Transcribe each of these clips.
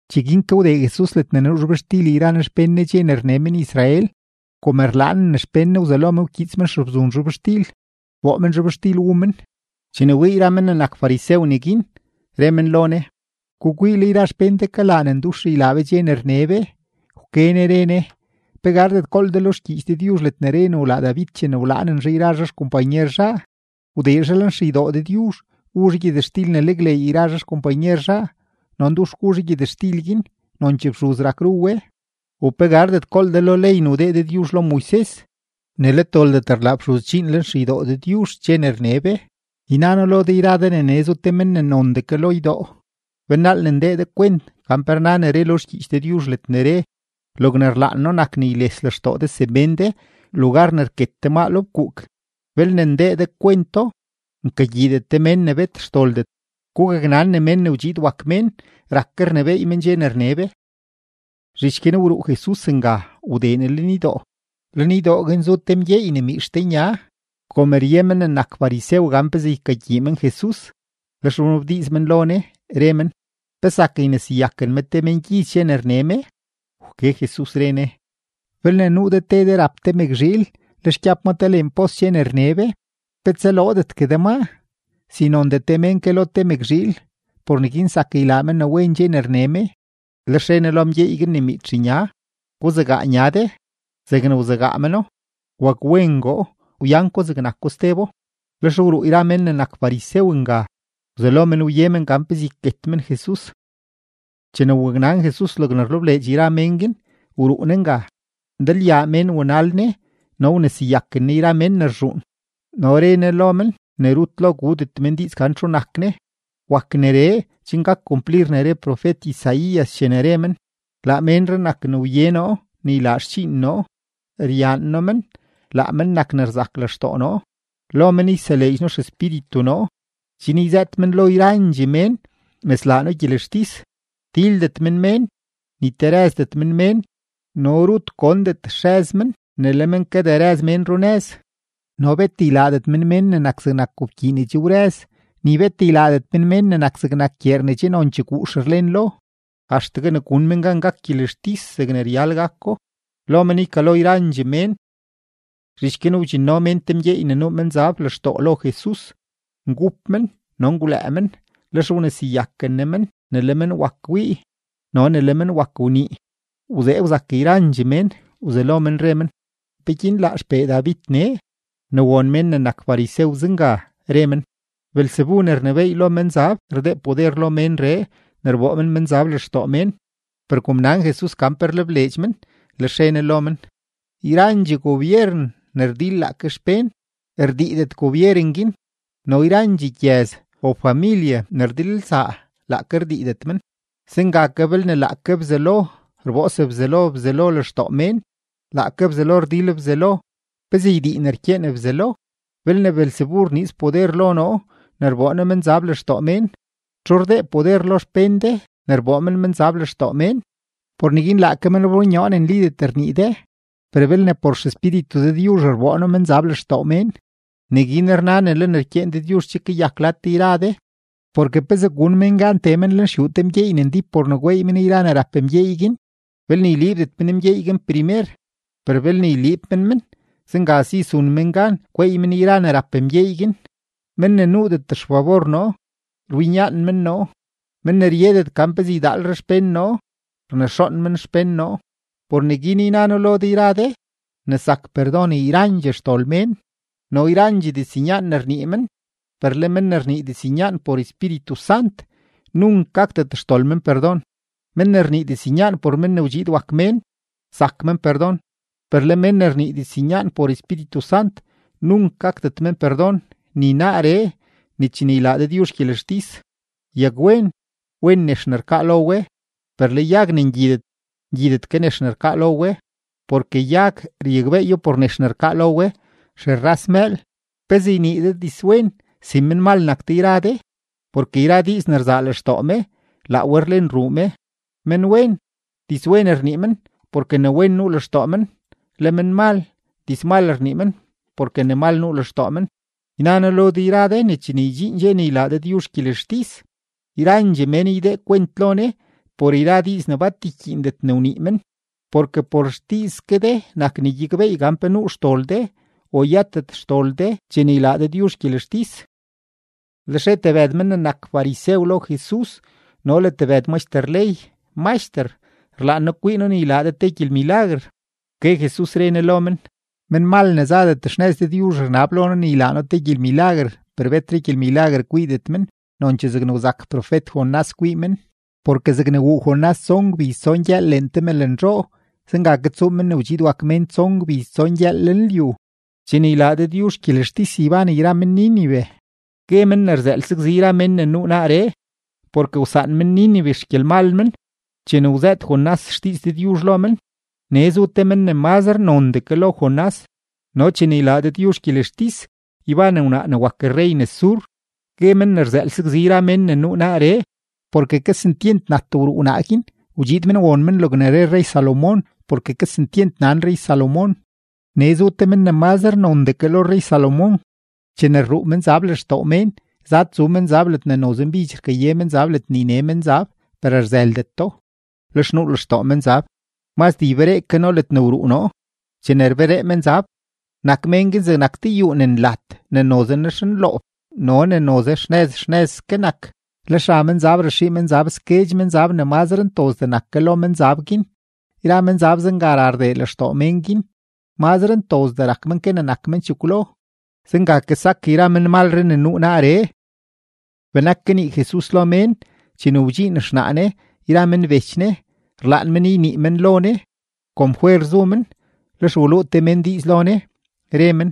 Cheguin ke wdee Jesus ledne nuu zhobxtil yra Ne xpén Ne dxe ne rne men-Israel. Kom rlaanen xpén Ne, wzelo men wkyiits men xebzun zhobxtil, wboo men zhobxtil wu men. Chene wii yra men ne nak farisew neguin, re men lo Ne: ―Gukwii, le yra xpén de kalaa ne ndux ylaa be dxe ne rne be. Wke Ne re Ne: ―¿Pe gardet gool de lo xgyiich Dëdyuzh ledne re ne wlaa David chene wlaanen zhaa yra zhaa xkompanyer zhaa? Wdee zhaa lenxeydoo Dëdyuzh, wu zhaa gyëtxtil ne nakleey yra zhaa xkompanyer zhaa, no ndux gu zhaa gyëtxtil guin, nonchee fxuz rak ru we. ¿U pe gardet gool de lo ley ne wdee Dëdyuzh lo Moises ne let doldet rlaa fxuz dxiin lenxeydoo Dëdyuzh dxe ne rne be? Yna noo lo de yra de ne nee zu te men ne nondee ke lo ydoo. Belnaal ne ndee de kwent gan pe rna ne re lo xgyiich Dëdyuzh ledne re: “Logne rlaan noo nak ne yles lextoo de semén de, lugar ne rket de maa lo fkuuk.” Belne ndee de kwento, nkagyiidet de mén ne bet xdoldet. Gugaknan ne Men ne wdxiid wak Mén rak ke rnebééy men dxe ne rne be. Zhich guin wruu Jesus nga, wdee Ne lenydoo. Lenydoo guin zu te mgyeey ne miitx te nya. Kom rye men ne nak farisew gan pezee ykagyii men Jesus, lex wnabdiiz men lo Ne, re men: ―¿Pe zak yneseyaken me te mengyiz dxe ne rne me? Wke Jesus, re Ne: ―Belne nuu de te de rap te mëkzhiil, lex gyab ma te leen pos dxe ne rne be, ¿pe tsaloodetgue de maa? Si nondee te mén ke lo te mëkzhiil. Por neguin zak ylaa me ne wen dxe ne rne me. Lex re Ne lo mgyeey guin ne miitx nya: ―Guzegaa nya de. Zegne wzegaa meno, wakwengoo, wyan ko zegnako stebo. Lex wruu yra men ne nak farisew nga, wzelo men wye men gan pezee yket men Jesus. Chene waknan Jesus logne rlebleedx yra mén guin, wruu Ne nga. Ndalyaa mén wanal Ne, no wneseyaken Ne yra mén ne rzhuun, no re Ne lo men ne rut lo gudet men diiz gan txu nak Ne. Wak neree chen gak kumplir ne re profet-Isaías chene re men: Laa ménree nak ne wye noo ne ylaa xdxiin noo, ryaan noo men. Laa men nak ne rzak lextoo noo. Lo men yseleedx noo XEspíritu noo, chen yzëët men lo yrandxee mén ne slaa noo gyelextis. Tildet men mén, ni terëzdet men mén, no rut gondet xrëz men ne le men kaderëz mén runëz. No bet ylaadet men mén ne nak zegnak gobkyii ne che wrëz, ni bet ylaadet men mén ne nak zegnak gyeer ne che nonchee guux rlen lo, axtegue ne gun men gan gak gyelextis zegne ryal gako. Lo men ykalo yrandxee mén. Zhich guin wdxinno mén te mgyeey ne nuu menzab lextoo lo Jesus; ngup men no ngwlëë men. Lex wneseyaken Ne men ne le men wak wii no ne le men wak wnii. Wzee wzak yrandxee mén, wzelo men re men: ―¿Peguin laa XPee David nee? Ne won men ne nak farisew zenga, re men: ―Beelzebu ne rnebééy lo menzab rdee poder lo ménree ne rboo men menzab lextoo mén. Per kom nan Jesus gan pe rlebleedx men, lex re Ne lo men: ―Yrandxee gobyeren ne rdil laake xpén, rdiidet gobyeren guin; no yrandxee gyëz o familye ne rdilelsaa, laake rdiidet men. Zenga ke, belne laake Bzelo rboo sebzelo Bzelo lextoo mén, laake Bzelo rdil Bzelo. ¿Pezee ydii ne rkyeen Bzelo? Belne Beelzebu rniiz poder lo noo ne rboo noo menzab lextoo mén, ¿txu rdee poder lo xpén de ne rboo men menzab lextoo mén? Por neguin laake men rbonyoo ne nlidet rnii de. Per belne por XEspíritu Dëdyuzh rboo noo menzab lextoo mén, neguin rna ne le ne rkyeen Dëdyuzh che kayak lad de yra de. ’Porke ¿pezee gun mén gan tee men lenxyuu te mgyeey ne ndíp por ne gweey men yra ne rap mgyeey guin, belne yliibdet men mgyeey guin primer? Per belne yliib men men, zenga si zun men gan gweey men yra ne rap mgyeey guin. ’Men ne nuudet xfabor noo, rwinyaan men noo; men ne ryedet gan pezee ydaalre xpén noo, rnexoon men xpén noo. ’Por neguin yna noo lo de yra de ne zak perdon yrandxee xdol mén no yrandxee diznyaan ne rnii men, per le men ne rnii diznyaan por Espíritu Sant, nunk gakdet xdol men perdon. Men ne rnii diznyaan por Men ne wdxiid wak Mén, zak men perdon; per le men ne rnii diznyaan por Espíritu Sant, nunk gakdet men perdon ni naaree ni chene ylaa Dëdyuzh gyelextis. ’Yagwen, wen nex ne rkaa lo we, per le yag ne ngyidet, ngyidet ke nex ne rkaa lo we. Porke yag ryakbeeyo por nex ne rkaa lo we. ¡Xerras mëël! ¿Pezee ynii de dizwen si menmal nak de yra de? Porke yra diiz ne rzaa lextoo me, laa we rlen ruu me. Menwen, dizwen rnii men porke ne wen nuu lextoo men; le menmal, dizmal rnii men porke ne mal nuu lextoo men. Yna noo lo de yra de ne chene ydxiin dxe ne ylaa Dëdyuzh gyelextis, yrandxee mén ydee kwent lo Ne por yra diiz ne bat rkyiindet ne wnii men. Porke por xdiiz ke de nak ne gyakbeey gan pe nuu xdol de o yëtet xdol de chene ylaa Dëdyuzh gyelextis. Lex re tebëd men ne nak farisew lo Jesus no le tebëd maxter ley: ―Maxter, rlaan noo kwii noo ne ylaa de te gyelmilaguer. Wke Jesus, re Ne lo men: ―Menmal ne zadet xnëz Dëdyuzh rnab lo noo ne ylaa noo te gyelmilaguer, per betre gyelmilaguer kwiidet men, nonchee zegne wzak profet-Jonás kwii men. Porke zegne wuu Jonás tson gbiz tson gyëël leen te mëlnzhoo, zenga ke tsuu Men ne wdxiid wak Mén tson gbiz tson gyëël lenlyu. Chene ylaa Dëdyuzh gyelextis, yban yra men-Nínive, gue men ne rzëël sakzi yra men ne nuu naaree; porke wsaan men-Nínive xgyelmal men chene wzëët Jonás xdiiz Dëdyuzh lo men; nee zu te men ne mazre nondee ke lo Jonás. No chene ylaa Dëdyuzh gyelextis, yban wnaa ne wak rrey nes Sur, gue men ne rzëël sakzi yra men ne nuu naaree. Porke kesentyent nat wruu wnaa guin wdxiid men won men logne re rrey-Salomón porke kesentyent nan rrey-Salomón; nee zu te men ne mazre nondee ke lo rrey-Salomón. ’Chene rruu menzab lextoo mén, zad tsu menzab ledne noze mbidx rkaye menzab ledne yne menzab, per rzëldeto. Lex nuu lextoo menzab: “Mazdee yberee ke noo ledne wruu noo.” Chene rberee menzab, nak mén guin zegnak te yuu ne nlat ne noze nexnloob no ne noze xnëz xnëzske nak. Lex ra menzab raxii menzab sguedx menzab ne mazre ntozdee nak ke lo menzab guin; yra menzab zenga ra rdee lextoo mén guin; mazre ntozdee rak men ke ne nak men chekwlo. Zenga ke sak yra menmalree ne nuu naaree. Benak kanii Jesus lo mén, chene wdxiin xnaa Ne yra men bech Ne, rlaan men ynii men lo Ne. Kom fwer zu men, lex waluu te mén diiz lo Ne, re men: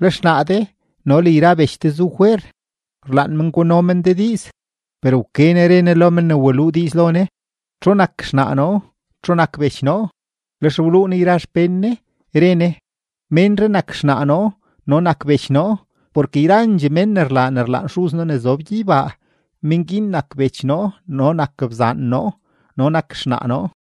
―Le xnaa de no le yra bech de zu fwer, rlaan men guno men de diiz. Per wke Ne re Ne lo men ne waluu diiz lo Ne: ―¿Txu nak xnaa noo? ¿Txu nak bech noo? Lex wluu Ne yra xpén Ne, re Ne: ―Ménree nak xnaa noo no nak bech noo. Porke yrandxee mén ne rlaa ne rlaan Xuz noo ne zob gyeybaa, mén guin nak bech noo no nak bzaan noo no nak xnaa noo.